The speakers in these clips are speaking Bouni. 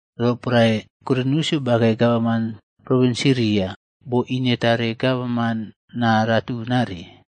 Roporae Kwiriniusꞌyo bakei gavaman provins Siria boinetare gavaman naa ratunare.a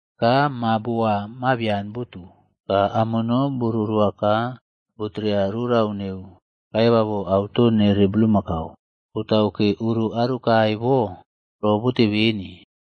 Ka maa booa mabian neuwo botu. Ka amono boꞌrorowa ka botere rorau neu kaivavo auto nere bulmakau. Botau ke oro aro kae bo robote beni.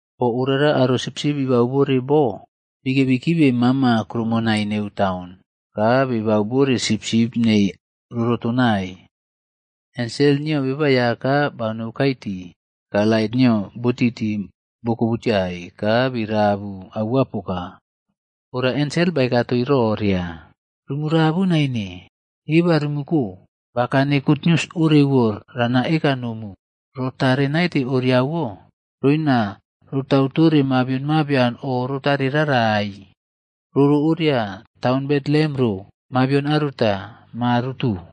Bo orara aro sipsipb bibau bore bo, bikebi kibe mama kuroumonai neu taun, ka bibau bore sipsip neii roꞌrotonai. Ensel nio Beba Aiyaka banoukai tii, ka lait nio botiti bokobutiai ka birabu aua poka. Ora ensel baeka toii roria. “Rumu rabu naine. Eba rumu ko. Bakane gutnius orewo rana eka nomu, ro tare naite oriawo. Roina rotautore mabion mabian o rotare rarai. Roro oria taun Betlehem ro, mabion aruta, Ma rotu.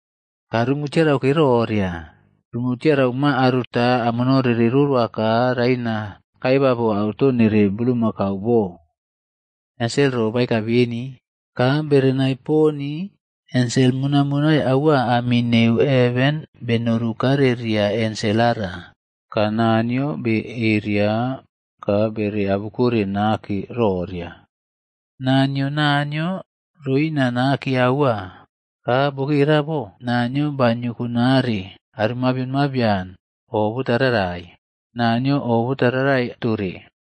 Ka rumu tiarau ke roria. Rumu tiara ma aruta amono rere roroa ka raina tau kaivavo auto nere bulmakau bo.” Ensel ro baeka beni, ka berenai poni ensel monaiꞌmonai aua ami neu heven benoru kare ria ensel ara. Ka Naniyo naa beꞌeria ka bere abukore nake roria, “Naa nio Naniyo roina nake aua. Ka bokera bo Naniyo banioko nare aro mabion mabian o botararai. Naniyo oꞌbota rarai tore.”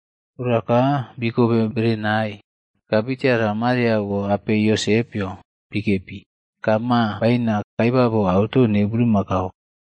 Ora ka bikobe berenai, ka bitiarai Mariaꞌwo apei Yosepꞌyo bikepi, ka maa baina kaivavo auto neu bulmakau.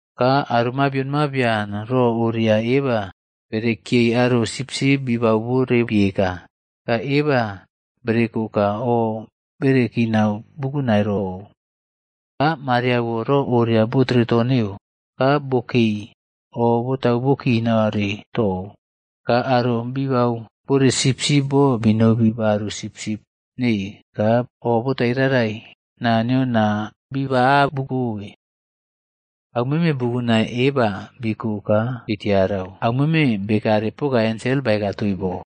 Ka aro mabion mabian ro oria eba berekiyei aro sipsip bibau bore bieka, ka eba bereko ka o bere kinau bukunai rou. Ka Mariaꞌwo ro orewo botere to neu, ka bokei oꞌbotau bo kinare tou. Ka aro bibau bore sipsip bo binobi baru sipsip nei ka o botai rarai Naniyo naa biba abukobe. Au meme bukunai eba biko ka bitiarau. Au meme bekare poka ensel baeka toii bo.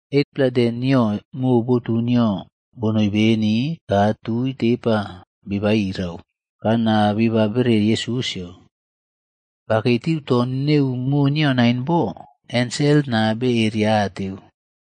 8-pla dei nio mo botu nio bonoi beni, ka tui tepa biba irau, ka naa biba bere Yesusꞌyo. Bakei tiu to neu mo nio nain bo, ensel naa beria ateu.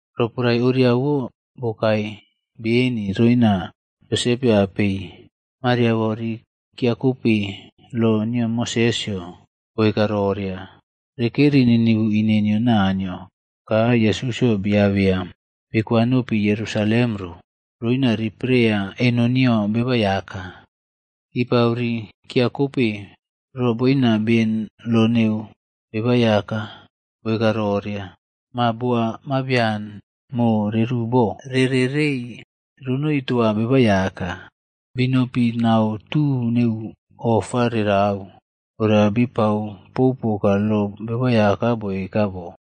Roporae oriawo bokae beni roina Yosepꞌyo apei Mariaꞌwo ri kiyeukope lo nio Mosesꞌyo boeka roria, rekeri ninivu ine nio Naniyo. Ka Yesusꞌyo biabeya bikwanopi Yerusalemd ro, roina ripreiya eno nio Beba Aiyaka. Kipau ri kiyeukope ro boina beni lo nio Beba Aiyaka baeka roria, “Ma booa mabian mo reru bo rere rei ronoi toa Beba Aiyaka.” Binopi nau tu neu ofa rerau, ora bipau pou poka lo Beba Aiyaka baeka bo,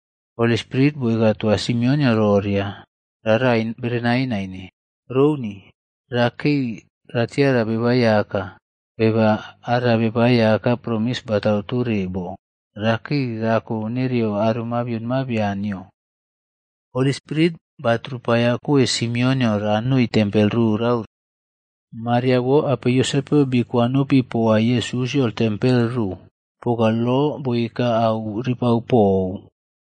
Holi Spirit boeka toa Simeonꞌyo roria rarai berenai naine. Rouni. Rakei ratiara Beba Aiyaka, beba ara Beba Aiyaka promis batau tore bo, rakae rako nereyo mabion mabian nio. Holi Spirit batrupaiyakoe Simeonꞌyo ranoi tempel rorau ro. Mariaꞌwo apei Yosepꞌyo bii kwanopi poa Yesusꞌyo tempel ro poka lo boeka au ripau pou.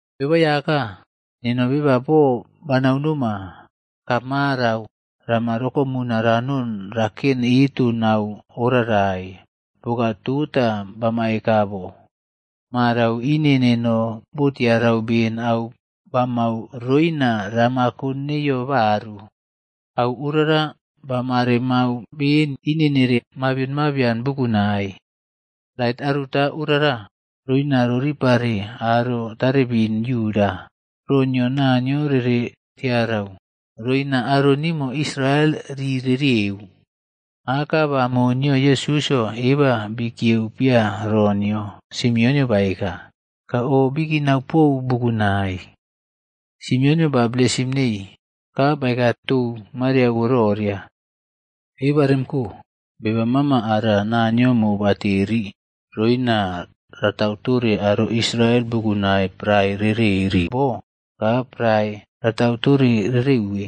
“Beba Aiyaka, neno beba boo banau noma, ka marau rama rokomuna ranon raken eto nau oꞌrarai, poka tota bama eka bo. Marau ine neno bo tiarau beni au bamau roina ramako neiyo baru. Au orara bamare mau been ine nere mabion mabian bukunai. Lait aruta orara, roina roripare aro taribin Yuda, ro nio Naniyo rere tiarau, roina aro nimo Israel ri rerieu.” Aka ba mo nio Yesusꞌyo eba bii kiyeu piya ro nio Simeonꞌyo baeka, ka o bikinau pou bukunai. Simeonꞌyo ba blesim neii, ka baeka tou Mariaꞌwo roria, “Eba rem ko. Beba mama ara Naniyo mobateri roina ratau tore aro Israel bukunai prae reꞌreri bo, ka prae ratau tore rere uwe.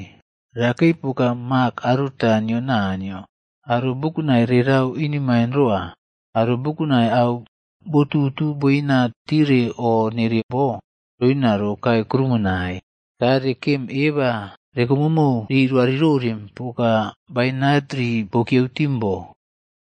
Rakei poka mak aruta nio Naniyo, aro bukunai rerau inemain roa. Aro bukunai au botutu boina tiere o nere bo, roina rokae kuroumonai. Ka rekem eba rekomomou riꞌroarirorem poka bainat rii bokiyeu tim bo.”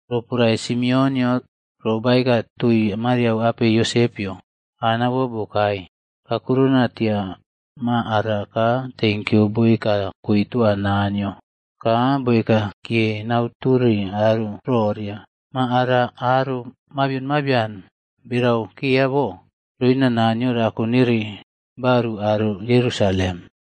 Roporae Simeonꞌyo ro baeka toi Maria apei Josepꞌyo, Anaꞌwo bokae kakurona tia ma ara ka tenkyu boeka koe toa Naniyo. Ka boeka kiye nau tore aro roria ma ara aro mabion mabian berau keya bo, roina Naniyo rako nere baru aro Yerusalem.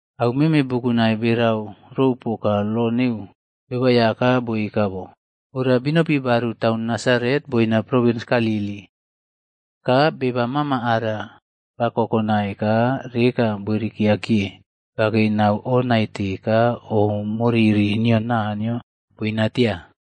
Au meme bukunai berau rou poka lo neu Beba Aiyaka boeka bo, ora binopi baru Taun Nasaret boina provins Galili. Ka beba mama ara ba kokonai ka reka boirikeya kiye, bakei nau oꞌnaite ka o moriri nio Naniyo boinatia.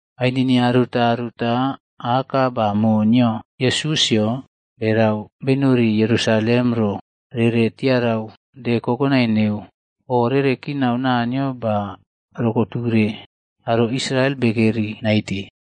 Ainini aruta aruta aka ba mo nio Yesusꞌyo berau benori Yerusalem ro rere tiarau De Kokonai neu o rere kinau Naniyo ba rokoture aro Israel Bekeri Naite,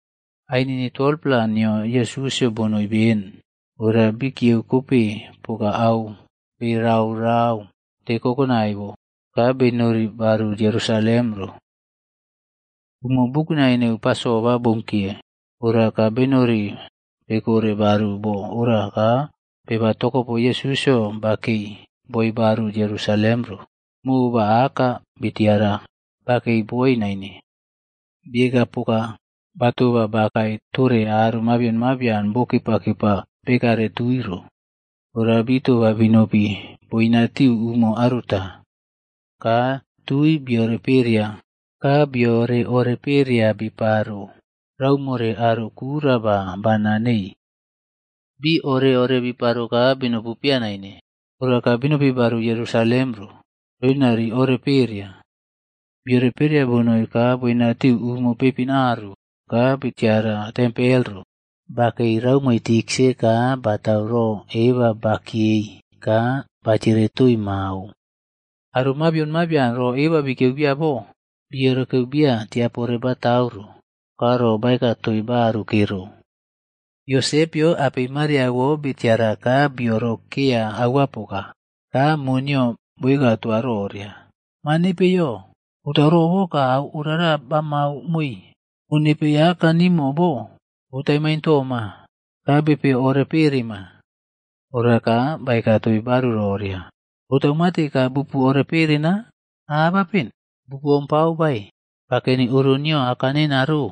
Ainini 12-pla nio Yesusꞌyo bonoi beni, ora bii kieu kope poka au beraꞌrau de kokonai bo, ka benori baru Yerusalem ro. Umo bukunai neu Pasova bounkiye, ora ka benori bekore baru bo ora ka beba tokopo Yesusꞌyo bakei boi baru Yerusalem ro. Mo ba aka bitiara bakei boi naine. Bieka poka batoba bakae tore aro mabion mabian bo kepaꞌkepa bekare tui ro. Ora bii toba binopi boinatiu umo aruta. Ka tui biore pakeya ka biore oreꞌpereya biparo raumore aro kura ba bana neii. Bii ore ore biparo ka binopu piya naine. Ora ka binopi baru Yerusalem ro, roina ri ore pereya. Biore pereya bonoi ka boinatiu umo peipin aru, ka bitiara tempel ro. Bakei raumo tiksa ka batau ro eba bakiyei ka batiere toii mao. Aro mabian ro eba bikiyeu bia bo, bi orekeu bia tiapore batau ro, ka ro baeka toii baru kero. Yosepꞌyo apei Mariaꞌwo bitiara ka biorokeya aua poka. Ka mo nio boeka toa roria. “Ma nepeiyo botau robo ka au orara bamau moii? O nepei aka nimo bo, botai maintooma ka bepe ore perema.” Ora ka baeka toii baru roria, “Botau mate ka bupu oreꞌperena? Abapen, Bupu ompau bae bakeni oro nio Aka neno ro?”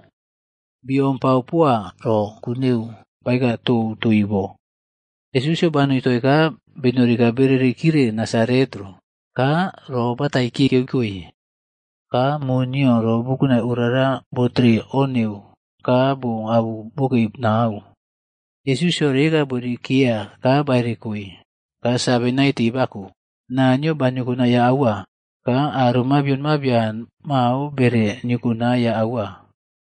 Biompau poa ro ku neu baeka tou toii bo. Yesusꞌyo banoi toii ka benori ka bereri kire Nasaret ro. Ka ro batai kiꞌkiyeu koe. Ka mo nio ro bukunai orara botere o neu ka bo abu bokei nau. Yesusꞌyo reka boirikeya ka ba erekoe, ka save naite bako. Naniyo ba niokonaiya aua. Ka aro mabion mabian mao bere niokonaiya aua.